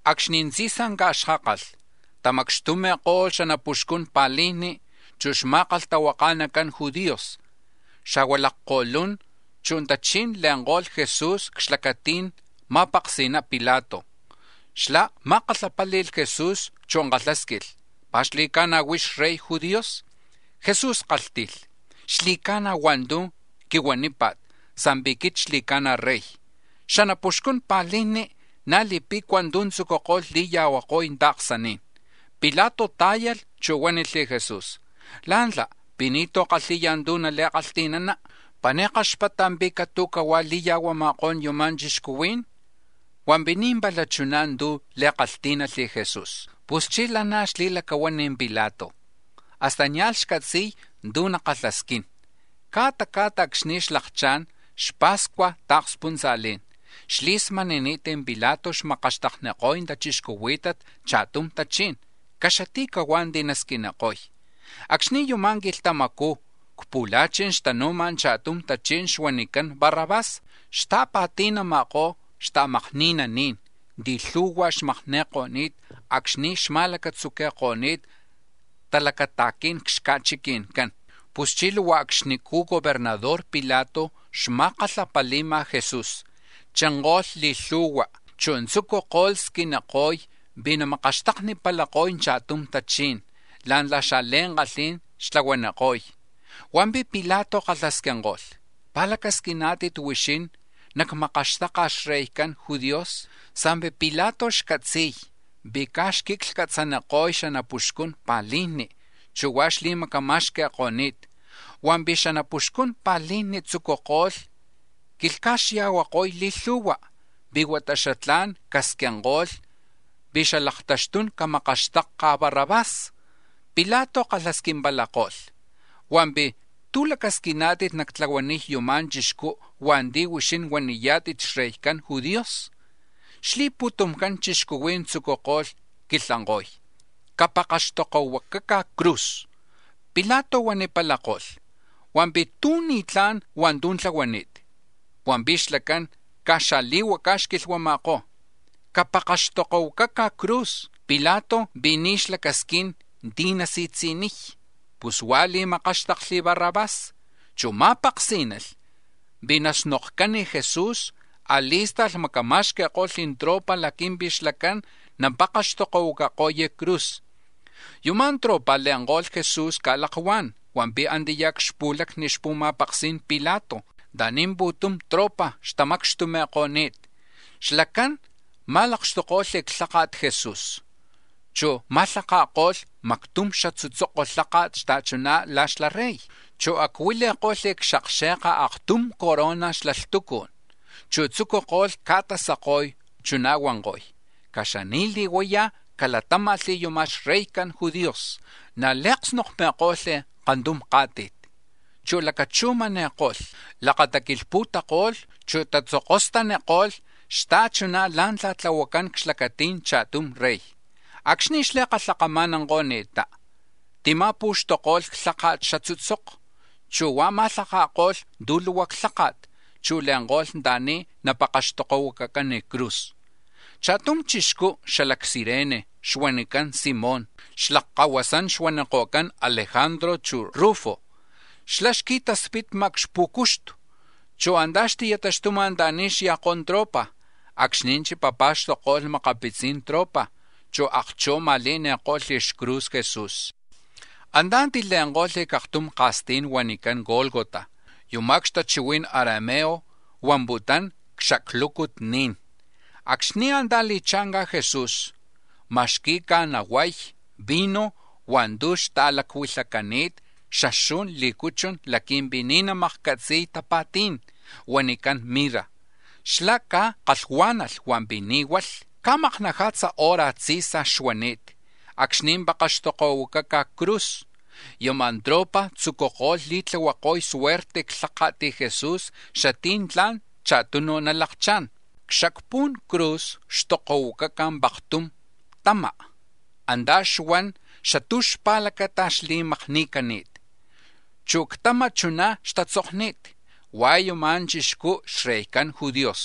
Acxni̱ tzi̱sa ca̱xkákalh, tamacxtumi̱palako̱lh xanapuxcun pa̱lijni, chu̱ xma̱kalhtahuaka̱nacan judíos, xa̱hua̱ lakko̱lún, chu̱ tachí̱n le̱nko̱lh Jesús c-xlacati̱n ma̱paksi̱na Pilato. Xlá̱ ma̱kalhapáli̱lh Jesús, chu̱ kalhásquilh: —¿Pi̱ xli̱ca̱na̱ huix xReycan judíos? Jesús kálhti̱lh: —Xli̱ca̱na̱ hua̱ntu̱ quilhuámpa̱t sa̱mpi̱ quit xli̱ca̱na̱ rey. Xanapuxcun pa̱lijni na̱ li̱pe̱cua̱ tu̱ tzúculh li̱ya̱huako̱y ta̱ksaní̱n. Pilato tá̱yalh chu̱ huánilh Jesús: —¿Lá̱ntla̱ pi̱ ni̱tú̱ kalhi̱ya tu̱ li̱kalhti̱nana? ¿Pi̱ ni̱ kaxpata̱ pi̱ catu̱huá̱ li̱ya̱huama̱kó̱n yuma̱ chixcuhuí̱n? Hua̱mpi̱ ni̱ pala chuná̱ tú̱ kalhtí̱nalh Jesús. Puschí̱ lanaj xli̱lacahuán Pilato, hasta nia̱lh cátzi̱lh tú̱ nakalhasquín. Ca̱ta ca̱ta̱ acxni̱ xlakchá̱n xapa̱scuaj ta̱kspuntza̱lí̱n, xli̱smani̱ni̱t Pilato xmakaxtakniko̱y tachixcuhuí̱tat cha̱tum tachí̱n, caxati̱cahuá̱ ti̱ nasquiniko̱y. Acxni̱ yama̱ quilhtamacú̱ c-pu̱la̱chi̱n xtanu̱ma̱ cha̱tum tachí̱n xuanicán Barrabás, xta̱pa̱ti̱nama̱kó̱ xta̱makni̱naní̱n ti̱ lhu̱hua̱ xmakni̱ko̱ni̱t acxni̱ xma̱lacatzuqui̱ko̱ni̱t talacata̱quí̱n c-xca̱chiqui̱ncán. Puschí̱ luhua acxnicú̱ gobernador Pilato xma̱kalhapali̱ma̱ Jesús, chinko̱lh li̱lhu̱hua, chu̱ tzucuko̱lh squiniko̱y pi̱ namakaxtaknipalako̱y cha̱tum tachí̱n la̱ntla̱ xa̱li̱ankalhí̱n xtlahuaniko̱y. Hua̱mpi̱ Pilato kalhasquinko̱lh: —¿Pi̱ lacasquiná̱tit huixín, cacmakáxtakli̱ xreycan judíos? Sa̱mpi̱ Pilato xcatzi̱y pi̱ caj xquiclhcatzaniko̱y xanapuxcun pa̱lijni, chu̱ huá̱ xli̱macama̱xqui̱ko̱ni̱t. Hua̱mpi̱ xanapuxcun pa̱lijni̱ tzucuko̱lh quilhca̱xya̱huako̱y li̱lhu̱hua, pi̱ huata xatlá̱n casquinko̱lh pi̱ xalaktaxtún camakaxtakca̱ Barrabás. Pilato kalhasquimpalako̱lh: —Hua̱mpi̱ ¿tú̱ lacasquiná̱tit nactlahuaniy yama̱ chixcú̱ hua̱nti̱ huixín huaniyá̱tit xreycan judíos? Xli̱putumcan chixcuhuí̱n tzucuko̱lh quilhanko̱y: —¡Capakaxtokohuacaca̱ c-cruz! Pilato huanipalakó̱: —Hua̱mpi̱ ¿tú̱ ni̱tlá̱n hua̱ntu̱ tlahuani̱t? Hua̱mpi̱ xlacán caj xaa̱li̱huacá̱ xquilhama̱kó̱: —¡Capakaxtokohuacaca̱ c-cruz! Pilato pi̱ ni̱ xlacasquín tí̱ nasi̱tzi̱niy, pus huá̱ li̱makáxtakli̱ Barrabás, chu̱ ma̱paksí̱nalh pi̱ naka̱snokcán Jesús, a̱li̱sta̱lh macama̱xqui̱ko̱lh tropa̱ laqui̱mpi̱ xlacán napakaxtokohuacako̱y c-cruz. Yama̱ tropa̱ le̱nko̱lh Jesús ca̱lakuá̱n, hua̱mpi̱ antiyá̱ c-xpu̱lacni xpu̱ma̱paksí̱n Pilato anta̱ni̱ pu̱tum tropa̱ xtamacxtumi̱ko̱ni̱t. Xlacán ma̱makxtuko̱lh xlháka̱t Jesús, chu̱ ma̱lhaka̱ko̱lh mactum xatzutzoko lháka̱t xta̱chuná̱ la̱ xla rey, chu̱ acuili̱ko̱lh c-xakxe̱ka aktum corona xla lhtucú̱n. Chu̱ tzucuko̱lh ca̱tasako̱y, chuná̱ huanko̱lh: —¡Caxani̱li̱huayá̱ calatáma̱lh yuma̱ xReycan judíos! Na̱ li̱aksnokmi̱ko̱lh kantum ká̱ti̱t, chu̱ lacachujmani̱ko̱lh, lakataquilhpu̱tako̱lh, chu̱ tatzokostaniko̱lh xta̱chuná̱ la̱ntla̱ tlahuacán c-xlacati̱n cha̱tum Rey. Acxni̱ xli̱kama̱nanko̱ni̱ttá, tima̱pu̱xtuko̱lh xlháka̱t xatzutzoko, chu̱ huá̱ ma̱lhaka̱ko̱lh tu̱ luhua xlháka̱t, chu̱ le̱nko̱lh anta̱ni̱ napakaxtokohuacacán c-cruz. Cha̱tum chixcú xala c-Cirene xuanicán Simón, xlakkahuasán xuaniko̱cán Alejandro, chu̱ Rufo, xlá̱ xqui̱taspitma̱ c-xpú̱cuxtu, chu̱ antá̱ xti̱taxtuma̱ anta̱ni̱ xya̱kó̱ tropa̱ acxni̱ chipapa̱xtokko̱lh makapitzi̱n tropa̱, chu̱ akchú̱ ma̱le̱ni̱ko̱lh xcruz Jesús. Antá̱ tile̱nko̱lh c-aktum ka̱stí̱n huanicán Gólgota. (Yuma̱ c-xatachihui̱n arameo huamputún C-xaclucut ni̱n.) Acxni̱ antá̱ li̱cha̱nca̱ Jesús, ma̱xqui̱ca̱ nahuay vino hua̱ntu̱ xta̱lacuilhacani̱t xaxu̱n lí̱cuchun laqui̱mpi̱ ni̱ namakcatzi̱y tapa̱tí̱n, huanicán mirra. Xlá̱ caj kalhuá̱nalh hua̱mpi̱ ni̱ hualh. Ca̱maknaja̱tza hora tzí̱saj xuani̱t acxni̱ pakaxtokohuacaca̱ c-cruz. Yama̱ tropa̱ tzucuko̱lh li̱tlahuako̱y suerte xlhaka̱t Jesús xatí̱ tla̱n cha̱tunu̱ nalakchá̱n. C-xacpu̱n cruz xtokohuacaca̱ paktzu̱ tama, antá̱ xuan xatú̱ xpa̱lacata xli̱makni̱cani̱t, chu̱ c-tama̱ chuná̱ xtatzokni̱t: “Hua̱ yuma̱ chixcú xReycan judíos.”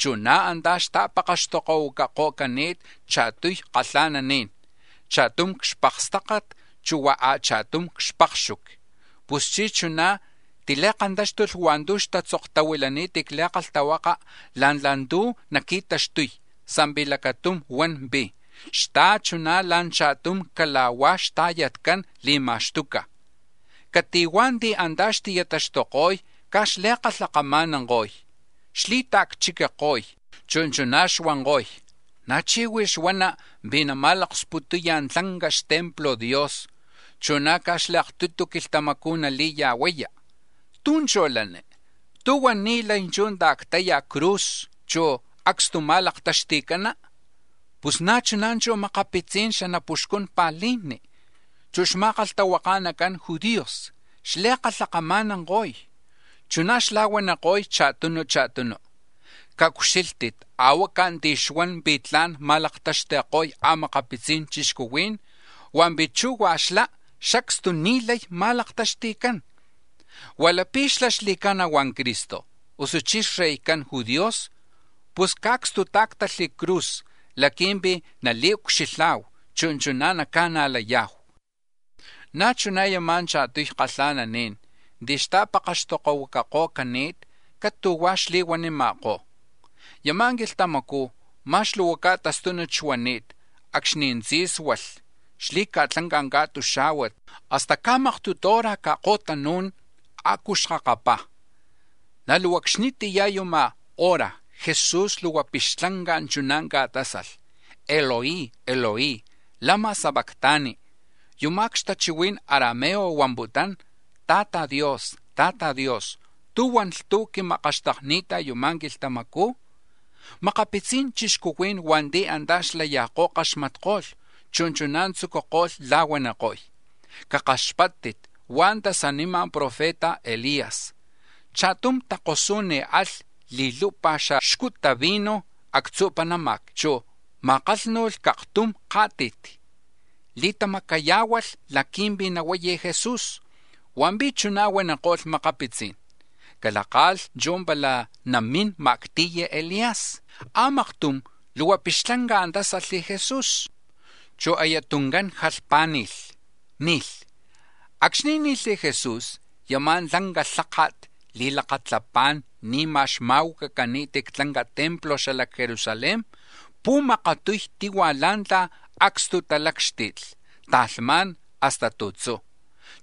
Chu̱ na̱ antá̱ xta̱pakaxtokohuacako̱cani̱t cha̱tuy kalha̱naní̱n, cha̱tum c-xpakstácat, chu̱ hua̱ a̱cha̱tum c-xpakxuqui. Puschí̱ chuná̱ tili̱kantáxtulh hua̱ntu̱ xtatzoktahuilani̱t c-Li̱kalhtahuaka̱ la̱ntla̱ tu̱ naqui̱taxtuy sa̱mpi̱ lacatum huan pi̱: “Xta̱chuná̱ la̱ cha̱tum cala̱hua̱ xta̱yatcán li̱ma̱xtuca̱.” Cati̱huá̱ ti̱ antá̱ xti̱taxtuko̱y caj xli̱kalhakama̱nanko̱y, xli̱ta̱cchiquiko̱y, chu̱ chuná̱ xuanko̱y: —¡Na̱ chí̱ huix huana̱ pi̱ nama̱laksputuya̱ tlanca xtemplo̱ Dios, chu̱ na̱ caj li̱aktutu quilhtamacú̱ nali̱ya̱huapalaya! ¿Tú̱ chú̱ lani? ¿Tú̱huan ni̱ lay chú̱ ta̱ctaya̱ c-cruz, chu̱ acstuma̱laktaxti̱cana̱? Pus na̱ chuná̱ chu̱ makapitzi̱n xanapuxcun pa̱lijni, chu̱ xma̱kalhtahuaka̱nacan judíos xli̱kalhakama̱nanko̱y; chuná̱ xla̱huaniko̱y cha̱tunu cha̱tunu: —¡Caucxílhtit a̱huaca̱ ti̱ xuan pi̱ tla̱n nama̱laktaxti̱ko̱y a̱makapitzi̱n chixcuhuí̱n hua̱mpi̱ chú̱ hua̱ xlá̱, xacstu ni̱ lay ma̱laktaxti̱cán! Huá̱ lapi̱ xlá̱ xli̱ca̱na̱ hua̱ Cristo, usuchí̱ xreycan judíos, pus caacstutáactalh c-cruz laqui̱mpi̱ nali̱ucxilha̱hu, chu̱ chuná̱ naca̱najlaniya̱hu. Na̱ chuná̱ yama̱ cha̱tuy kalha̱naní̱n ti̱ xta̱pakaxtokohuacako̱cani̱t catu̱huá̱ xli̱huanima̱kó̱. Yama̱ quilhtamacú̱, ma̱x luhua ca̱tastúnut xuani̱t, acxni̱ tzí̱sualh xli̱ca̱tlanca̱ ca̱tuxá̱huat, hasta ca̱maktutu hora ca̱ko̱tanú̱n a̱cu ca̱xkakapá̱. Na̱ luhua acxnitiyá̱ chú̱ yama̱ hora Jesús luhua pixtlanca̱ chuná̱ ca̱tásalh: “Eloi, Eloi, ¿lama sabactani?” (Yuma̱ c-xatachihui̱n arameo huamputún: “Tla̱ti Dios, Tla̱ti Dios, ¿tú̱huan lhtuj quimakaxtakni̱ta̱ yuma̱ quilhtamacú̱?”) Makapitzi̱n chixcuhuí̱n hua̱nti̱ antá̱ xlaya̱kó̱ kaxmatko̱lh, chu̱ chuná̱ tzucuko̱lh la̱huaniko̱y: —Cakaxpáttit, huá̱ tasanima̱ profeta Elías. Cha̱tum takosú̱n alh li̱lupa̱ xaxcuta vino actzu̱ panáma̱c, chu̱ ma̱akánu̱lh c-kantum ká̱ti̱t, li̱tamacayá̱hualh laqui̱mpi̱ nahuay Jesús. Hua̱mpi̱ chuná̱ huaniko̱lh makapitzí̱n: —Calaka̱lh chú̱ pala namín ma̱acti̱y Elías. A̱maktum luhua pixtlanca̱ tásalh Jesús, chu̱ aya tuncán jalhpá̱ni̱lh, ni̱lh. Acxni̱ ni̱lh Jesús yama̱ tlanca lháka̱t li̱lakalhapá̱n ni̱ma̱ xma̱huacacani̱t c-tlanca templo xala c-Jerusalén pu̱makatuy tihua̱ la̱ntla̱ acstutalácxti̱tli, ta̱lhmá̱n hasta tu̱tzú̱.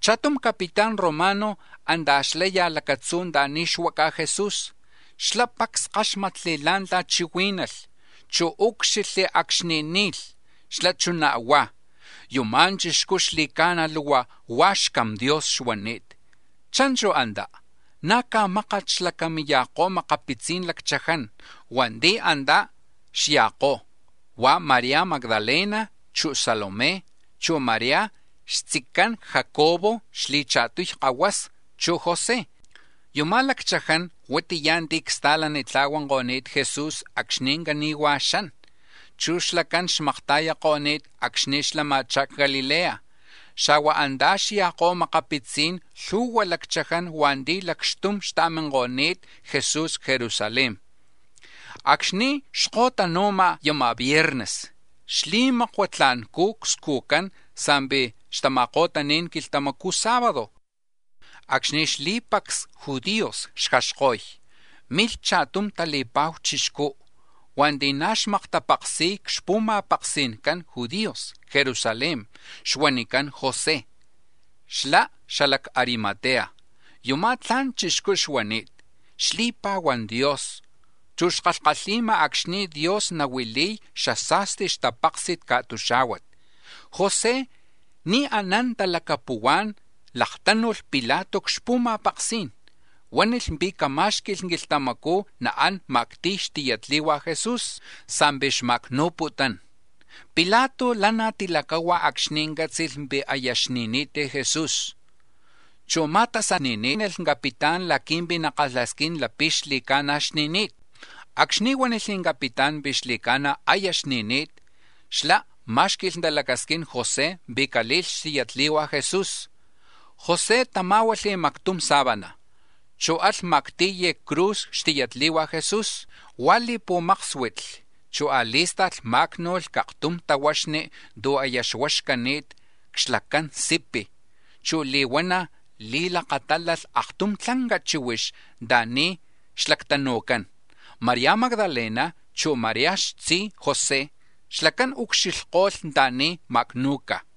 Cha̱tum capitán romano antá̱ xlaya̱ lacatzú̱ anta̱ni̱ xuaca̱ Jesús, xlá̱ pacs káxmatli̱ la̱ntla̱ chihuí̱nalh, chu̱ úcxilhli̱ acxni̱ ni̱lh. Xlá̱ chuná̱ huá̱: —Yuma̱ chixcú̱ xli̱ca̱na̱ luhua hua̱ Xcam Dios xuani̱t. Cha̱nchu̱ antá̱ na̱ caj mákat xlacamiya̱kó̱ makapitzi̱n lacchaján. Hua̱nti̱ na̱ antá̱ xya̱kó̱, huá̱ María Magdalena chu̱ Salomé, chu̱ María xtzican Jacobo xli̱cha̱tuy kahuasa, chu̱ José. Yuma̱ lacchaján huatiya̱ ti̱ csta̱lanitla̱huanko̱ni̱t Jesús acxni̱ cani̱huá̱ xan, chu̱ xlacán xmakta̱yako̱ni̱t acxni̱ xlama̱chá̱ c-Galilea. Xa̱hua̱ antá̱ xya̱kó̱ a̱makapitzi̱n lhu̱hua lacchaján hua̱nti̱ lacxtum xta̱minko̱ni̱t Jesús c-Jerusalén. Acxni̱ xko̱tanu̱ma̱ yama̱ viernes xli̱makua tla̱ncú̱ scujcán sa̱mpi̱ xtama̱ko̱tani̱n quilhtamacú̱ sábado acxni̱ xli̱pacs judíos xjaxko̱y, milh cha̱tum tali̱pa̱hu chixcú̱ hua̱nti̱ na̱ xmaktapaksi̱y c-xpu̱ma̱paksi̱ncan judíos c-Jerusalén xuanicán José, xlá̱ xala c-Arimatea. Yumá̱ tla̱n chixcú xuani̱t, xli̱pa̱huán Dios chu̱ xkalhkalhi̱ma̱ acxni̱ Dios nahuili̱y xasa̱sti xtapáksi̱t ca̱tuxá̱huat. José ni̱ anán talacapuhuá̱n laktánu̱lh Pilato c-xpu̱ma̱paksí̱n, huánilh pi̱ camá̱xqui̱lh quilhtamacú̱ naán ma̱acti̱y xtiyatli̱hua Jesús sa̱mpi̱ xma̱acnu̱putún. Pilato lanaj tilacahua̱ acxni̱ cátzi̱lh pi̱ aya xni̱ni̱t Jesús, chu̱ ma̱tasani̱ní̱nalh capitán laqui̱mpi̱ nakalhasquín lapi̱ xli̱ca̱na̱ xni̱ni̱t. Acxni̱ huánilh capitán pi̱ xli̱ca̱na̱ aya xni̱ni̱t, xlá̱ má̱xqui̱lh talacasquín José pi̱ cale̱lh xtiyatli̱hua̱ Jesús. José tamá̱hualh mactum sábana, chu̱ alh ma̱acti̱y c-cruz xtiyatli̱hua Jesús, huá̱ li̱pu̱máksuitli; chu̱ a̱li̱sta̱lh máacnu̱lh c-aktum tahuaxni̱ tu̱ aya xuaxcani̱t c-xlacan sipi̱, chu̱ li̱huana̱ li̱lakatálalh aktum tlanca chíhuix anta̱ni̱ xlactanu̱cán. María Magdalena, chu̱ María xtzi José, xlacán ucxilhko̱lh anta̱ni̱ ma̱acnu̱ca̱.